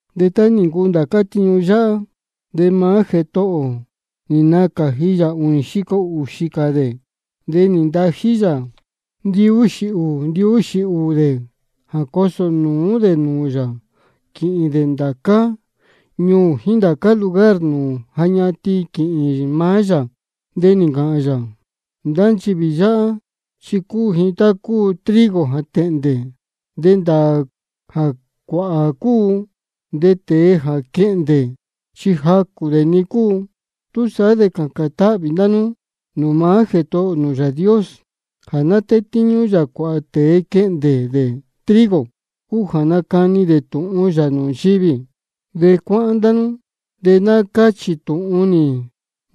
De tá nī ncuu ndācá tiñu yáhá, de maá Jētohō ō nī nacāji yā ūnī xico ūxī cā dē. De nī ntají yā ndihuū ndihuū dē jā cosō nūú dē nūū yā quīhīn dē ndācá ñuū jíín ndācá lugar nūū ja ñatin quīhīn maá yā. De nī ncāhān yā: Ndá nchivī yáhá chi cúu ji tá cúu trigo jā tēhndē, de ndāā jā cuāhā cúu, de tēe jā quehndē chi jacū dē-ni cúu. Túsaá de cācān táhvī ndá nú nūū maá Jētohō nū Yāā Dios jā ná tétíñú yā cuāhā tēe quehndē dē trigo, cúu jā nacani dē tūhun yā nūū nchivī. De cuáhán ndá nú, de ná cáchī tūhun nī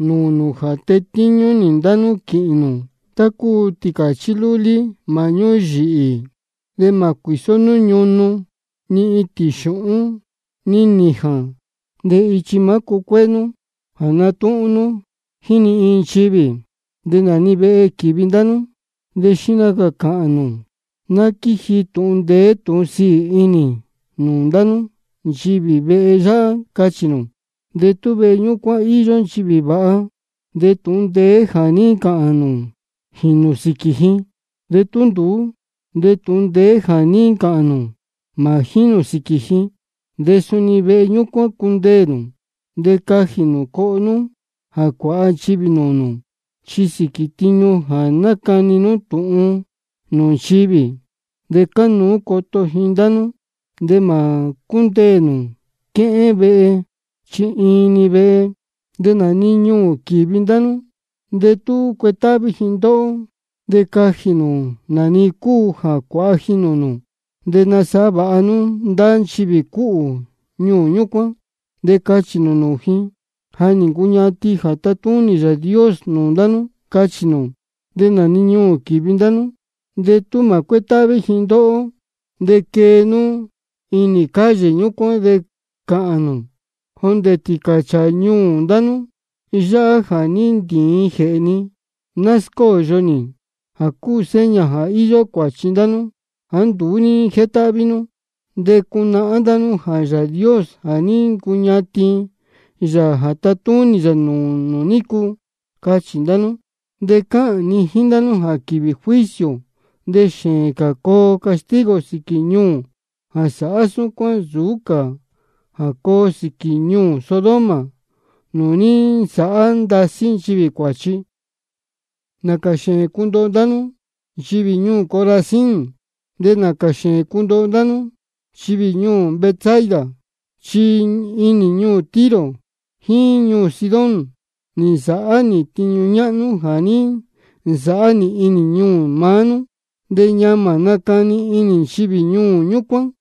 nūū nū jā tetíñú nī ndá nú quīhīn nū tá cúu tīcāchí lúlí māhñú yīhī. De mā cuīsó nú ñunu, ni itīn xūhún, ni nījān. De ichi mā cúcuéé nú jā natúhún nú jíín ni iin nchivī. De nā-ni vehe quīvi ndá nú, de xihna cā cāhān nū: Ná quíji tūhun ndeé tūhun sīī inī nūū ndá nú, nchivī vehe yáhá, cachī nū. De tú vehe ñúcuán íyó nchivī vāha, de tūhun ndeé jā ní ncāhān nū jīnū sīquī ji. De tú nduú, de tūhun ndeé jā ní ncāhān nū mā jínū sīquī ji. De suni vehe ñúcuán cundeē nū, de cajī nū coho nú jā cuāha nchivī nūū nū. Chi sīquī tiñu jā nácani nú tūhun nūū nchivī, de cánuú coto ji ndá nú. De mā cúndeē nū quéhén vehe, chi iin-ni vehe. De nā-ni ñuū quīvi ndá nú, de tú cuetáhví ji ndóhó, de cajī nū nā-ni cúu jā cuāha ji nūū nū. De nasāhá vāha nú ndá nchivī cúhū ñuū ñúcuán. De cachī nū nūū ji: Ja nī ncuñatin jā tatúnī Yāā Dios nūū ndá nú, cachī nū. De nā-ni ñuū quīvi ndá nú, de tú mā cuétáhví ji ndóhó, de quee nú inī calle ñúcuán de cāhān nū: Jondē tīcāchāā ñuū ndá nú yáhá jā ní ntīin jēhē ni, ná scóyo nī jā cúu seña jā íyó cuāchi ndá nú jāá nduú ní jétáhví nú. De cunahán ndá nú jā Yāā Dios ja nī ncuñatin yā jā tatúnī yā nūū nū nícu. Cachī ndá nú. De cáhān ni jíín ndá nú jā quīvī juicio de xēēn cā coo castigo sīquī ñuū jā sáhá súcuán nsūú cā jā coo sīquī ñuū Sodoma nūū ní nsāhá ndasí nchivī cuāchi. Nācā xēēn cundoho ndá nú, nchivī ñuū Corazín. De nācā xēēn cundoho ndá nú, nchivī ñuū Betsaida. Chi tú inī ñuū Tiro jíín ñuū Sidón ní nsáhá nī tiñu ñáhnú jā ní nsāhá nī inī ñuū maá nú, de ñamā nacani inī nchivī ñuū ñúcuán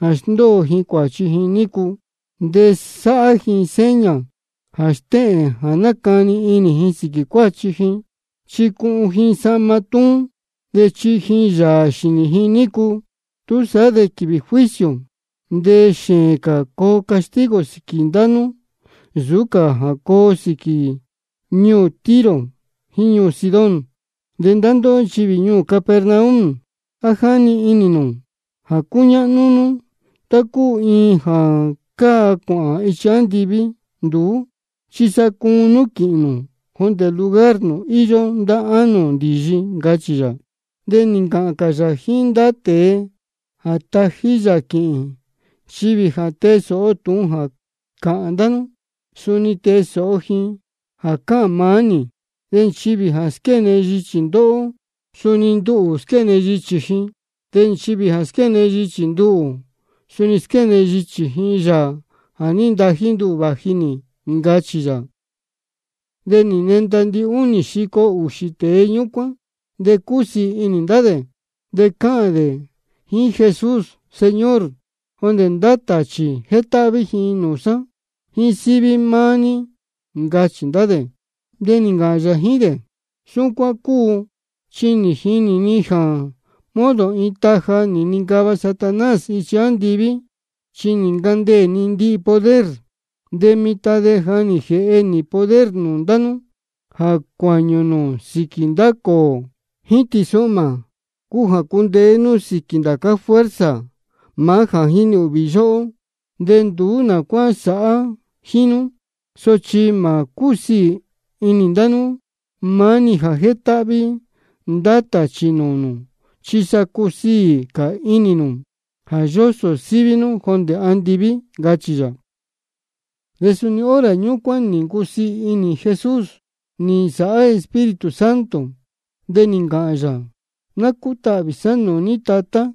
jā sndóo ji cuāchi ji nícu. De sāhá ji seña jā stéhēn jā nácani inī ji sīquī cuāchi ji, chi cuhun ji sahma túún de chihi ji yāā xīnī ji nícu. Túsaá de quīvī juicio de xēēn cā coo castigo sīquī ndá nú nsūú cā jā coo sīquī ñuū Tiro jíín ñuū Sidón. De ndá ndóhó nchivī ñuū Capernaum, ¿á jáni inī nū jā cúñáhnú nú tá cúu iin jā cáa cuāhān ichi andiví? Nduú chi sa cuun nú quīhīn nū jondē lugar nūū íyó ndá ánō ndīyi, ncachī yā. De nī ncāhān cā yā jíín ndá tēe jā tají yā quīhīn: Nchivī jā tee sōho tūhun jā cáhān ndá nú, suni tee sōho ji jā cáhān maá nī. De nchivī jā squéne yichī ndóhó, suni nduhū squéne yichī ji. De nchivī jā squéne yichī nduhū, suni squéne yichī ji Yāā jā ní ntají nduhū vāji nī, ncachī yā. De nī nenda ndihúnī xico ūxī tēe ñúcuán, de cúsiī inī ndá dē, de cáhān dē jíín Jesús: Señor, jondē ndá tāchī jétáhví ji nūū sá jā jíín síví maá ní, ncachī ndá dē. De nī ncāhān yā jíín dē: Súcuán cúu, chi nī jinī ni jā modo iin taja nī nincava Satanás ichi andiví, chi nī ncandeē ni ndihi poder. De mitan de ja nī jēhe nī poder nūū ndá nú jā cuāñū nū sīquī ndá cōō jíín tīsuhmā, cúu jā cundeé nú sīquī ndācá fuerza maá jā jínī ūhvī yóhó, de nduú nā cuá sāhá jíín nú. Sochi mā cúsiī inī ndá nú maá-ni jā jétáhví ndá tāchī nūū nū, chi sa cusiī cā inī nū jā yósō síví nú jondē andiví, ncachī yā. De suni hora ñúcuán nī ncusiī inī Jesús nī nsāhá Espíritu Santo, de nī ncāhān yā: Ná cútahvī sá nūū ní Tatá,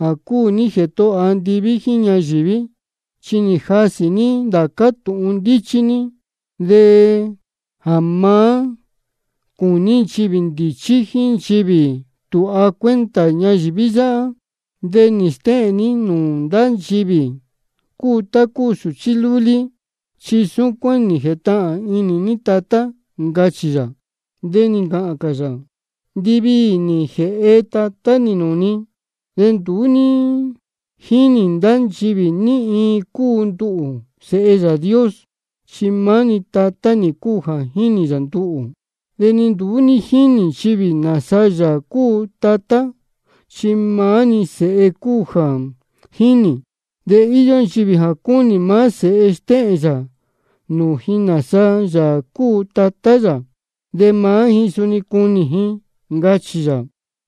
jā cúu ní Jētohō andiví jíín ñayīví. Chi nī jasī ní ndācá tūhun ndíchí ní, jā má cūní nchivī ndīchí jíín nchivī tūha cuenta ñayīví yáhá. De nī stéhēn ní nūū ndá nchivī cúu tá cúu sūchí lúlí. Chi súcuán nī jētahān inī ní Tatá, ncachī yā. De nī ncāhān cā yā: Ndiviī nī jēhe Tatá nī nūū ni. De nduú jínī ndá nchivī ní iin cúu nduhū, Sēhe Yāā Dios, chi maá-ni Tatá nī cúu jā jínī yā nduhū. De ni nduú jínī nchivī nāsa Yāā cúu maá Tatá, chi maá-ni Sēhe cúu jā jínī. De íyó nchivī jā cúnī maá Sēhe stéhēn yā nūū ji nāsa Yāā cúu Tatá yā, de maá ji suni cunī ji, ncachī yā.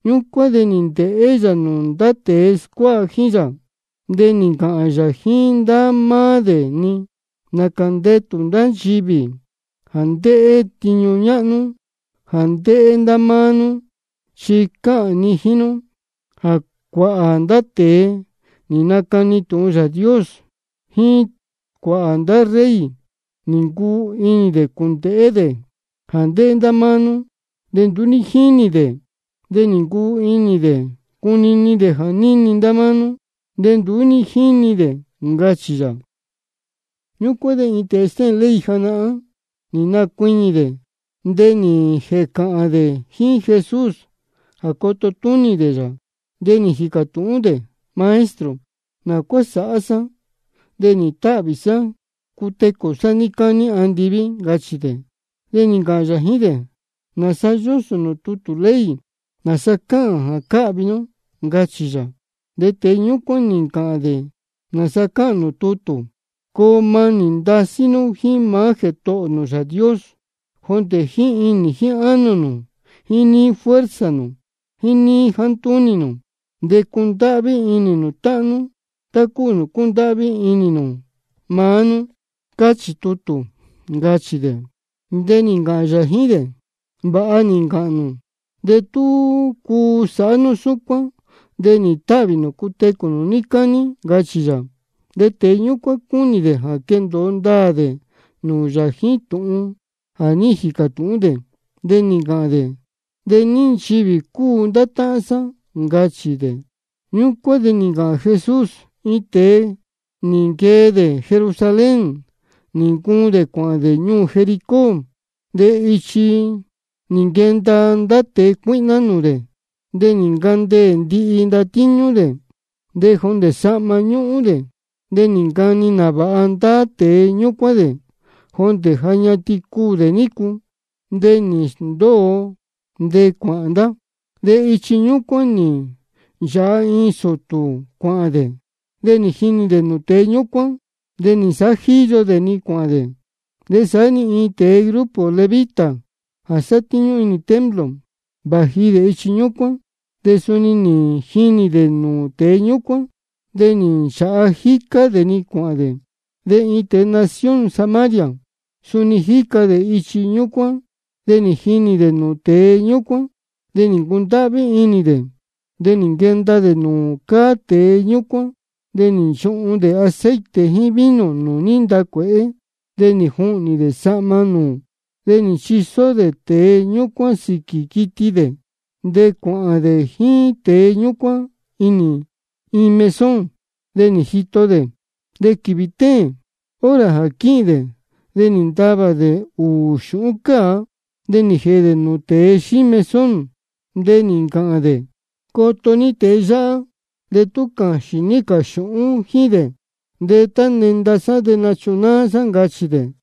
Ñúcuán de nī ndēhé yā nūū ndá tēe scuáha jíín yā, de nī ncāhān yā jíín ndá máá dē-ni: Nācā ndetū ndá nchivī jā ndéhé tiñu ñáhnú jā ndéhé ndá máá nú. Chi cáhān ni jíín nú jā cuāhā ndá tēe nī nacani tūhun Yāā Dios, jíín cuāhā ndá rey, nī ncuu inī dē cūndēhé dē jā ndéhé ndá máá nú, de nduú ní jínī dē. De nī ncuu inī dē cunini dē jā níni ndá máá nú, de nduú ní jíni dē, ncachī yā. Ñúcuán de iin tēe stéhēn ley janahán, nī nacuiñī dē, de nī jēcāhān dē jíín Jesús jā coto túnī dē yā. De nī jīcā tūhún dē: Maestro, ¿nā cuá sāhá sá de nīhīn táhvī sá cutecū sá níí cání andiví? ncachī dē. De nī ncāhān yā jíín dē: ¿Nāsa yósō nūū tutū ley? ¿Nāsa cáhān jā cáhvi nú? ncachī yā. De tēe ñúcuán nī ncāhān dē nāsa cáhān nūū tutū: Coo manī ndasí nú jíín maá Jētohō nū Yāā Dios, jondē jíín inī jíín ánō nū, jíín níí fuerza nū, jíín níí jāá ntúnī nū. De cundáhví inī nū táhán nú tá cúu nūū cúndáhví inī nū maá nú, cáchī tutū, ncachī dē. De nī ncāhān yā jíín dē: Vāha nī ncāhān nū. De tú cuu sāhá nú súcuán de nīhīn táhvī nū cutecū nū níí cání, ncachī yā. De tēe ñúcuán cúnī dē jā quendōo ndāā dē nūū yā jíín tūhun jā ní jīcā tūhún dē, de nī ncāhān dē: ¿De ní nchivī cúu ndá táhán sá? ncachī dē. Ñúcuán de nī ncāhān Jesús: Iin tēe nī nquee dē Jerusalén, nī ncuun dē cuāhān dē ñuū Jericó. De ichi nī nquenda ndá tēe cuíhná nūū dē, de nī ncandeē ndihi ndatíñú dē, de jondē sahma ñúhún dē. De nī ncani nāvāha ndá tēe ñúcuán dē, jondē ja ñatin cuū dē nícu. De nī sndóo ndá, de cuāhān ndá. De ichi ñúcuán nī nchāha iin sūtū cuāhān dē, de nī jinī dē nūū tēe ñúcuán, de nī nsāhá jíyo dē-ni cuāhān dē. De saá-ni iin tēe grupo levita jā sátíñú inī templo, vāji dē ichi ñúcuán, de suni nī jinī dē nūū tēe ñúcuán, de nī nchāha jícá dē-ni cuāhān dē. De iin tēe nación Samaria, suni jíca dē ichi ñúcuán. De nī jinī dē nūū tēe ñúcuán, de nī ncundáhví inī dē. De nī nquenda dē nūū cáá tēe ñúcuán, de nī nchuhun dē aceite jíín vino nūū ní ntacuēhé, de nī juhnī dē sahma nūū. De nī nchisó dē tēe ñúcuán sīquī quiti dē, de cuāhān dē jíín tēe ñúcuán iin mesón, de nī jito dē. De quīvī téēn, hora jā quíhīn dē, de nī ntavā dē ūū xūhún cāa, de nī jēhe dē nūū tēe xíí mesón, de nī ncāhān dē: Coto ní tēe yáhá, de tú cāxīn ní cā xūhún jíín dē, de tá nenda sá de nachunáá sá, ncachī dē.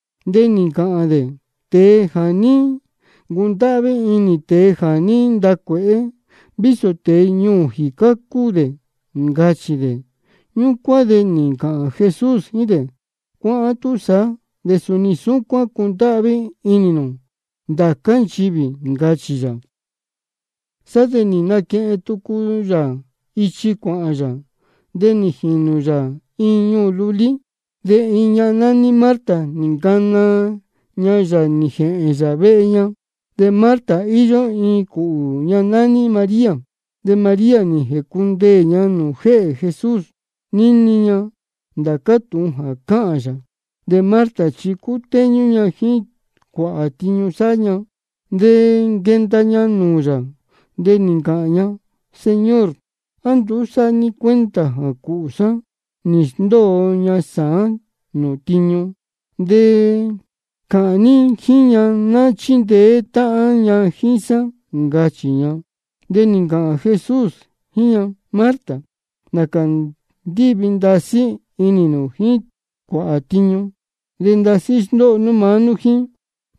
De nī ncāhān dē: Tēe jā ní ncundáhví inī tēe jā ní ntacuēhé, vísō tēe ñuū jīcá cúu dē, ncachī dē. Ñúcuán de nī ncāhān Jesús jíín dē: Cuáhán túsaá, de suni súcuán cundáhví inī nū ndācá nchivī, ncachī yā. Sá de nī nquehen tucu yā ichi cuāhān yā, de nī jīnū yā iin ñuū lulí. De iin ñahan nání Marta nī ncana ña yā nī jēhēn yā vehe ña. De Marta, íyó iin cūhū ña nání María. De María nī jēcundeē ña nūū jéhē Jesús, níni ña ndācá tūhun jā cáhān yā. De Marta chi cútéñú ña jíín cuāhā tiñu sáhá ña. De nī nquenda ña nūū yā, de nī ncāhān ña: Señor, ¿á nduú sáhá ní cuenta jā cūhū sá nī sndóo ña sāán nūū tiñu? De cāhān ní jíín ña ná chíndeé táhán ña jíín sá, ncachī ña. De nī ncāhān Jesús jíín ña: Marta, nācā ndíhvī ndasí inī nū jíín cuāhā tiñu, de ndasí sndóho nú maá nú jíín.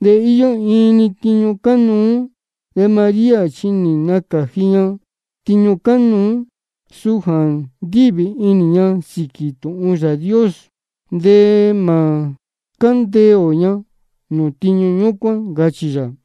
De íyó iin-ni tiñu cánuú. De María chi nī nacāji ña tiñu cánuú, suu jā ndíhvī inī ña sīquī tūhun Yāā Dios, de mā cándeē ō ña nūū tiñu ñúcuán, ncachī yā.